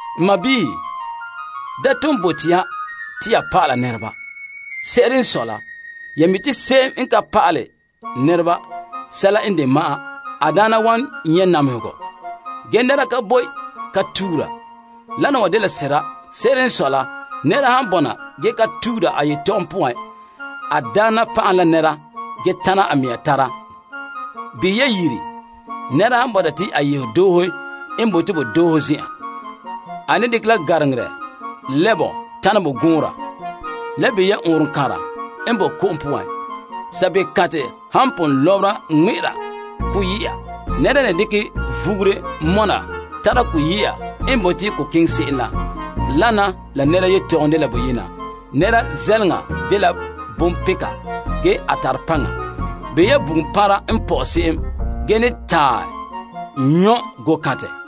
N sɔɔnrɔ, da ton bote ya te ya pa'ala. Se'ere n sɔe la, ya mi' te tomam pa'aleba han ka pa'ala nɛreba sɛla n de ma'an, tomam gankerɛ n wan gana zan'an. Ge nɛra ka boe ka tuura. Dena wa dela sera. Se'ere n sɔe la, nɛra han bɔna ge ka tuura a yetɔgom poan, a daana ba'ahɛ la nɛra ge tana a mɛŋa tara. Behɛ ya yiri. Nɛra han bɔta te a yeho doohe n bote bo doohe zen'an, a ne dekɛ la gariŋenɛ lɛ' bɔ tana bo gɔɔnra. Le behɛ ya ɔɔnrɔŋkanra n boe ko'om poan. Sabeeo kantɛ han pon lɔbera ŋmɛ'ɛra ko yɛ'a, nɛra n ne dekɛ vugure mɔna tara ko yɛ'a n bote ko keŋɛ se'em la. Wana la nɛra yetɔgom dela boyena. Nɛra zɛleŋa dela bonpeka ge a tare paŋa. Behɛ ya bugum panra n pɔ'ɛ se'em ge ne taɛ nyɔ' gookantɛ.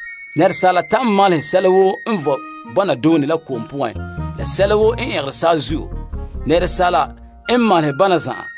Asaala ta'an malehɛ sɛla woo vɔe bɔna doone la ko'om poan la sɛla woo n ɛngera saazuo. Asaala n malehɛ bana zan'an.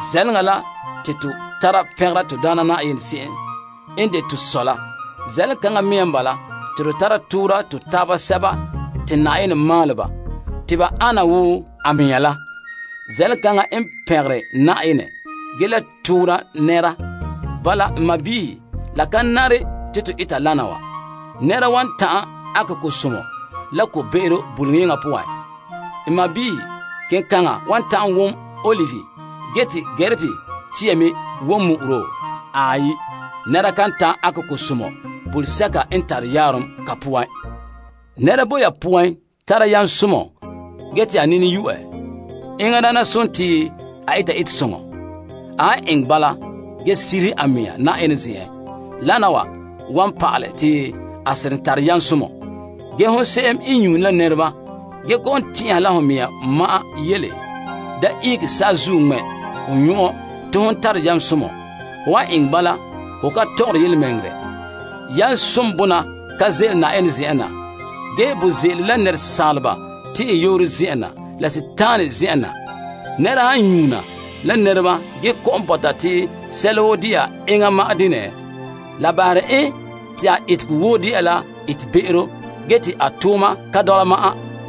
Zɛleŋa la te to tara pɛngera to Daana Na'ayenɛ se'em n de to Sɔ la. Zɛleŋa kaŋa mea n bala te to tara toora to taaba sɛba te Na'ayenɛ maalɛ ba te ba ana wo a mɛŋa la. Zɛleŋa kaŋa n pɛngere Na'ayenɛ ge le toora nɛra. Bala, n sɔɔnrɔ, la ka nare te to eta wana wa. Nɛra wan ta'an ankɛ ko'somɔ la ko'be'ero buleyeŋɔ poan? N sɔɔnrɔ, kenkaŋa wan ta'an wom ta'ama, ge te sinsanbega me wom mu'uro? Aai, nɛra kan ta'an ankɛ ko'somɔ bulesɛka n tare yaarom ka poan. Nɛra boe ya poan tara yam somɔ ge te a nini yo'ɛ? Enŋa daana sontii a eta etesoŋɔ. A han eŋɛ bala ge sirihe a mea Na'ayenɛ zen'en, wana wa wan pa'alɛ te a seren tare yam somɔ. Ge hon se'em n nyuune la nɛreba gee kɔ'ɔn tɛn'ɛha la ho mea ma'an yele, da ihege saazuo ŋmɛ' ho nyɔn'ɔn te hon tare yam somɔ. Ho han eŋɛ bala, ho ka tɔgɔre yelemɛŋɛrɛ. Yamsom bona ka ze'ele Na'ayenɛ zen'en na, ge bo ze'ele la saaleba tɛn'ɛyooro zen'en na, la sagona la zen'en na. Nɛra han nyuuna la nɛreba ge kɔ'ɔn bɔta te sɛla woo dela enŋa ma'an denɛ, la bahere en te a etegɔ woo de'a la etebe'ero ge te a tooma ka dɔla ma'an.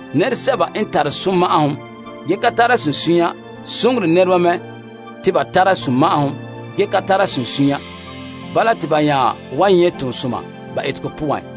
Nɛresɛba n tare sunma'ahom ge ka tare sunsunya soŋore nɛreba mɛ te ba tara sunma'ahom ge ka tara sunsunya. Bala te ba nya wan nyɛ' toonsoma ba etegɔ poan.